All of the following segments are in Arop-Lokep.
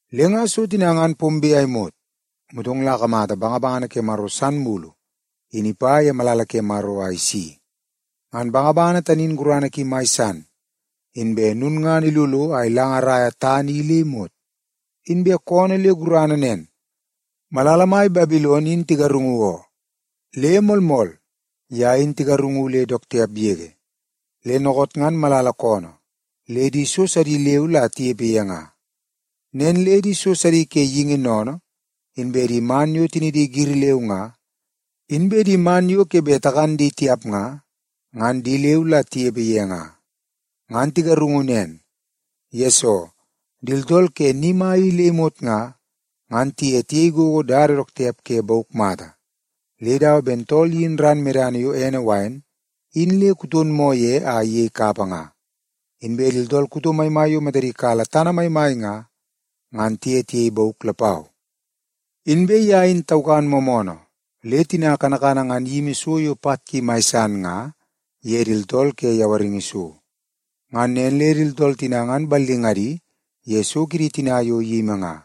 Le nga so tina ngan pombe a imot, motong la akamata bangabangana ke Maro san mulu in ipa ye malala ke Maro a isi. Ngan bangabangana tani in gurana ki mai san, inbe lulngana ilolo a ilangaraia tana i le imot. Inbe koonoo le gurana nen, “Malala mai Babilon in tigarungu oo. Le moolmool, ye in tigarungu le dook tiap yege. Le dookoot ngan malala koonoo le di so sidi leu la tinepe ye nga. Nen le di so sidi ke geingi sennene, inbe di man yo tinidi giri leu nga, inbe di man yo ke bet takan di tiap nga, ngan di leu la tinepe ye nga. Ngan tigarungu nen, yesoo di tooltool ke ni mai i le imot nga, ngan tiye tiyei gogo dada dook tiap ke bauk mata, le dawa ben tool iyin ran medana yo ene wain in le kuton moo ye a iyei kapa nga. Inbe di tooltool kuto maimai yo matadi kala tana maimai nga, ngan tiye tiyei bauk lapau. Inbe ye in taukan moomoonoo le tina kanakana ngan iyimi so yo pat ki mai san nga ye di tooltool ke yawaringi so. Ngan nen le di tooltool tina ngan ballingadi ye so kidi tina yo iyimi nga.”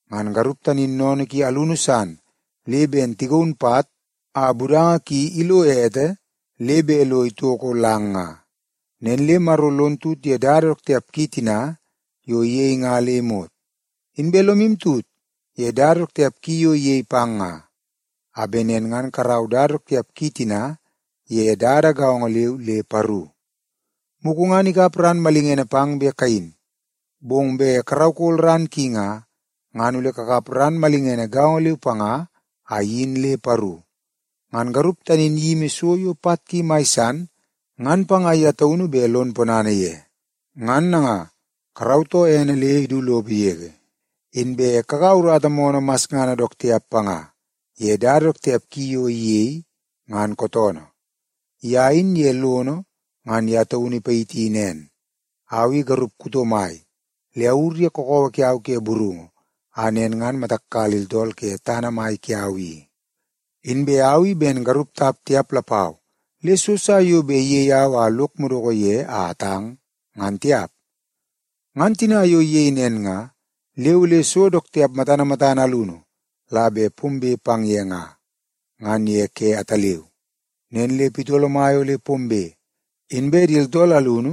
Ngan garup tani in sennene ki alunu san le ben tagaun pat a budanga ki ilo ete le bet lo itoko lang nga. Nen le Maro lon tut ye dada dook tiap ki tina yo iyei nga le imot. Inbe lomu tut ye dada dook tiap ki yo iyei pang nga, a bet nen ngan karau dada dook tiap ki tina ye dada gaongo leu le paru. Mugu ngan ikap ran malingene pang bet kayin, bong bet karaukol ran ki nga, ngan ole kakap ran malingene gaongo leu panga a iyin le paru. Ngan garup tani in iyimi so yo pat ki mai san ngan panga ye taunu bet lon ponana ye. Ngan nanga, karautoo ene le idu lopo yege, inbe kakaua urata moonoo masngana dook tiap panga ye dada dook tiap ki yo iyei, ngan kootoonoo. Ye in ye lono ngan ye taun ipayiti nen, ‘Au i garup kuto mai le awur ye kakawa kiau ke burungu a nen ngan matak kala di tooltool ke tana mai kiau i. Inbe au i ben garup tap tiap lapau, le so sa yo bet iyei au a lok madoko ye a atang, ngan tiap.’ Ngan tina yo iyei nen nga, le ole so dook tiap matana matana alunu la bet pombe pang ye nga, ngan ye ke ataleu. Nen le pitolo mai ole pombe, inbe di tooltool alunu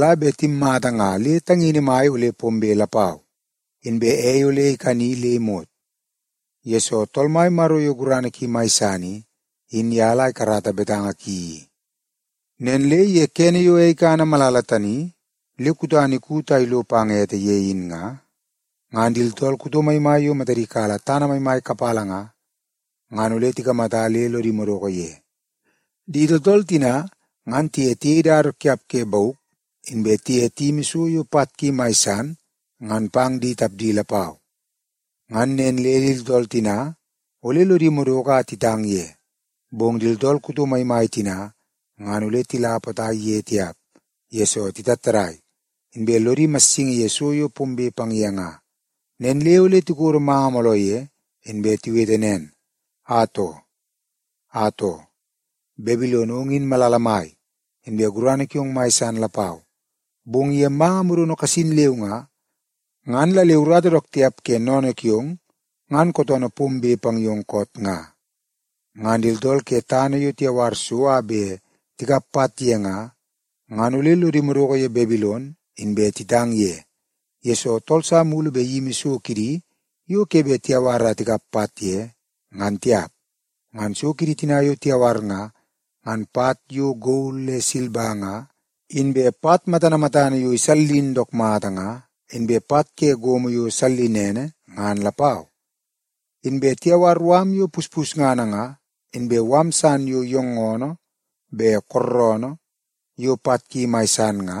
la bet timmata nga le tangini mai ole pombe lapau. Inbe ei ole ikani le imot, yesoo Tool Mai Maro yo gurana ki mai san i, in ye la ikarata betanga ki i. “Nen le ye kene yo ei ikana malala tani le kutana ikut a ilo pang ete ye in nga, ngan di tooltool kuto maimai yo matadi kala tana maimai kapala nga, ngan ole tikamata le lodi madoko ye. Di tooltool tina ngan tiye tiyei dada dook tiap ke bauk, inbe tiye tiyimi so yo pat ki mai san ngan pang di tapdi lapau. Ngan nen le di tooltool tina ole lodi madoko a titang ye. Bong di tooltool kuto maimai tina ngan ole tila potai ye tiap, yesoo titattadai, inbe lodi imassingi ye so yo pombe pang ye nga. Nen le ole tikodo manga mooloo ye, inbe tiwete nen, ‘Atoo! Atoo, Babilon ong in malala mai, inbe gurana kiong mai san lapau. Bong ye manga modono kasin leu nga, ngan la le urata dook tiap ke sennene kiong ngan kootoonoo pombe pang yong koot nga.’ “Ngan di tooltool ke tana yo tiyawar so a bet tikap pat ye nga, ngan ole lodi madoko ye Babilon inbe titang ye, yesoo tool sa mulu bet iyimi so kidi yo ke bet tiyawar a tikap pat ye, ngan tiap. Ngan so kidi tina yo tiyawar nga, ngan pat yo gol le silba nga, inbe pat matana matana yo isallin dook mata nga, inbe pat ke gomo yo sallinene ngan lapau. Inbe tiyawar mala yo puspusngana nga, inbe mala san yo yoongoonoo be kooroonoo yo pat ki mai san nga,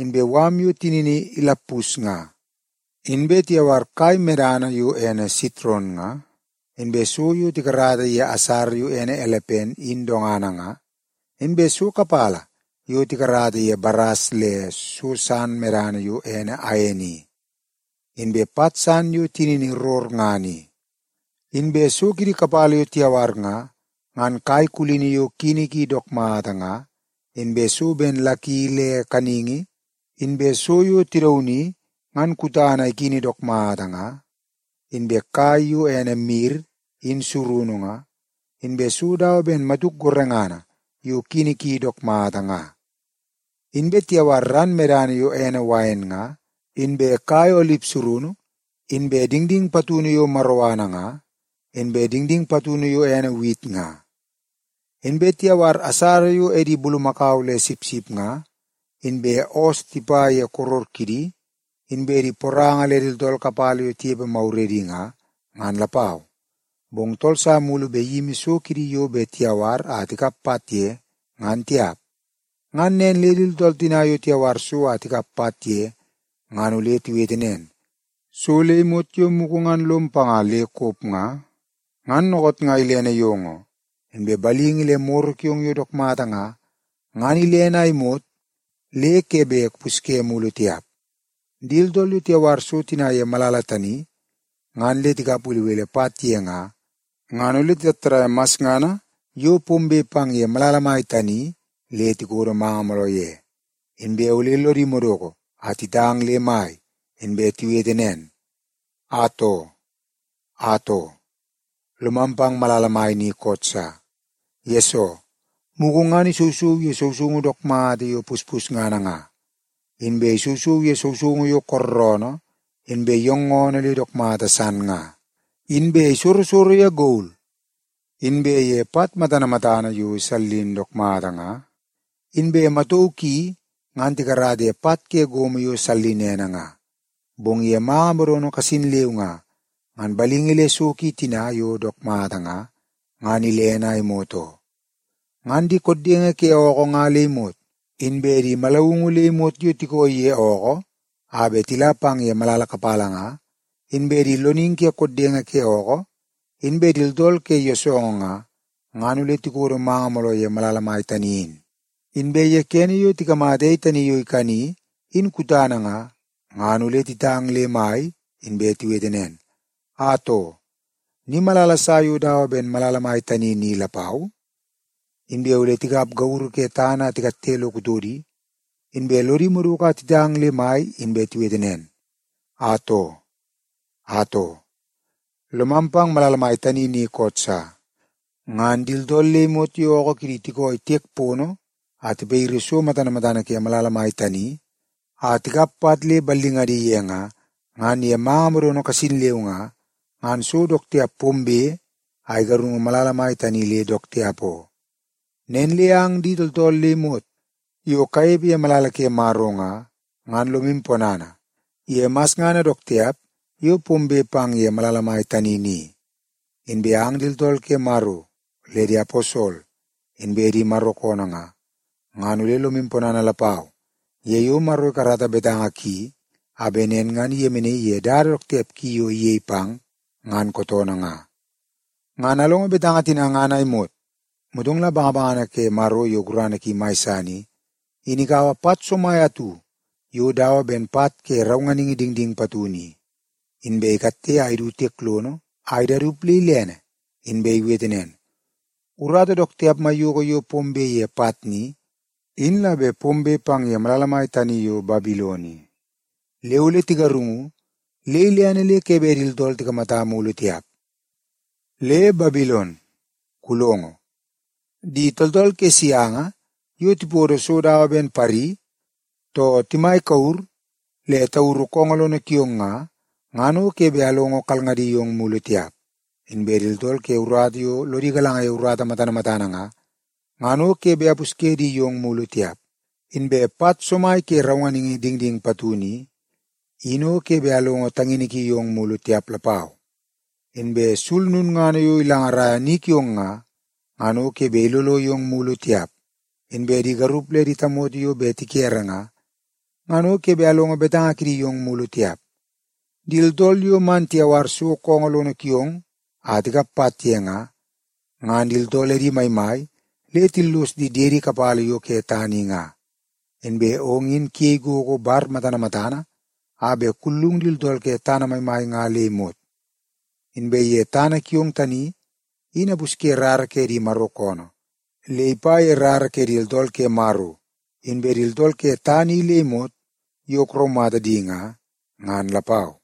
inbe mala yo tinini ilappus nga. Inbe tiyawar kai medana yo ene sitron nga, inbe so yo tikarata ye asara yo ene elepen in dongana nga, inbe so kapala yo tikarata ye baras le so san medana yo ene ain i, inbe pat san yo tinini rorngana i. Inbe so kidi kapala yo tiyawar nga, ngan kai kulini yo kini ki dook mata nga, inbe so ben laki ke kaningi, inbe so yo tidauni ngan kutana ikini dook mata nga, inbe kai yo ene mir in surunu nga, inbe so dawa ben matuk gorengana yo kini ki dook mata nga. Inbe tiyawar ran medana yo ene wain nga, inbe kai olip surunu, inbe dingding patunu yo maroana nga, inbe dingding patunu yo ene wit nga. Inbe tiyawar asara yo edi bulumakau le sipsip nga, inbe oos tipa ye koror kidi, inbe di poranga le di tooltool kapala yo tinepe maguredi nga, ngan lapau. Bong tool sa mulu bet iyimi so kidi yo bet tiyawar a tikap pat ye, ngan tiap. “Ngan nen le di tooltool tina yo tiyawar so a tikap pat ye ngan ole tiwete nen, ‘So le imot yo mugu ngan lom panga le kop nga, ngan dookoot nga ilene yong oo. Inbe balingi le moro kiong yo dook mata nga, ngan ilene a imot le ke bet kupusye mulu tiap.’ “Di tooltool yo tiyawar so tina ye malala tani ngan le tikap belebele pat ye nga, ngan ole titattadaia masngana yo pombe pang ye malala mai tani le tikodo manga mooloo ye. Inbe ole lodi madoko a titang le mai, inbe tiwete nen, ‘Atoo! Atoo, lomam pang malala mai ni koot sa, yesoo mugu ngan isousou ye sousoungu dook mata yo puspusngana nga, inbe isousou ye sousoungu yo kooroonoo inbe yoongoonoo le dook mata san nga. Inbe isorosoro ye gol inbe ye pat matana matana yo isallin dook mata nga, inbe matauu ki ngan tikarata ye pat ke gomo yo sallinene nga. Bong ye manga modono kasin leu nga, ngan balingi le so ki tina yo dook mata nga, ngan ilene a imot oo.’ “Ngan di koddenge ke ookoo nga le imot, inbe di manungu le imot yo tikooi ye ookoo a bet tila pang ye malala kapala nga, inbe di loningi ke koddenge ke ookoo, inbe di tooltool ke yoosoongoo nga, ngan ole tikodo manga mooloo ye malala mai tani in. Inbe ye kene yo tikamata ei tani yo ikani, in kutana nga, ngan ole titang le mai, inbe tiwete nen, ‘Atoo, ni malala sa yo dawa ben malala mai tani ni lapau?’ Inbe ole tikap gauru ke tana a tikatte lo kutodi, inbe lodi madoko a titang le mai inbe tiwete nen, ‘Atoo! Atoo, lomam pang malala mai tani ni koot sa. Ngan di tooltool le imot yo ookoo kidi tikooi tiek pono a tipayiri so matana matana ke malala mai tani a tikap pat le ballingadi ye nga, ngan ye manga modono kasin leu nga, ngan so dook tiap pombe a igarungu malala mai tani le dook tiap oo. Nen le ang di tooltool le imot yo kanepe ye malala ke Maro nga, ngan lomu ponana ye masngana dook tiap yo pombe pang ye malala mai tani ni. Inbe ang di tooltool ke Maro le di aposol inbe di Maro koonoo nga, ngan ole lomu ponana lapau ye yo Maro ikarata betanga ki a bet nen ngan iyemenaii ye dada dook tiap ki yo iyei pang, ngan kootoonoo nga.’” Ngan alongo betanga tina ngan a imot, motong la bangabangana ke Maro yo gurana ki mai san i, in ikaua pat somai atu yo dawa ben pat ke raunganingi dingding patunu i, inbe ikatte a idu tiek lono a idaudat le ilene. Inbe iwete nen, “Urata dook tiap maiyoko yo pombe ye pat ni, in la bet pombe pang ye malala mai tani yo Babilon i. Le ole tigarungu le ilene le ke bet di tooltool tikamata mulu tiap. Le, Babilon, kulongo! Di tooltool ke sianga yo tipodo so dawa ben pari, too timai kure le tauru koongoo lono kiong nga, ngan o ke bet amlongo kalngadi yong mulu tiap. Inbe di tooltool ke urata yo lodi galanga ye urata matana matana nga, ngan o ke bet ampusye di yong mulu tiap. Inbe pat somai ke raunganingi dingding patunu i, in o ke bet amlongo tangini ki yong mulu tiap lapau. Inbe sul lulngana yo ilangaraia ni kiong nga, ngan o ke bet ilolo yong mulu tiap. Inbe di garup le di tamoto yo bet tikere nga, ngan o ke bet amlongo betanga kidi yong mulu tiap. Di tooltool yo man tiyawar so koongoo lono kiong a tikap pat ye nga, ngan di tooltool edi maimai le tillos di diedi kapala yo ke tana i nga. Inbe ong in kuyei gogo bar matana matana a bet kullung di tooltool ke tana maimai nga le imot. Inbe ye tana kiong tani in ampusye rara ke di Maro koonoo le ipa ye rara ke di tooltool ke Maro, inbe di tooltool ke tana i le imot yo kuraumata di nga, ngan lapau.”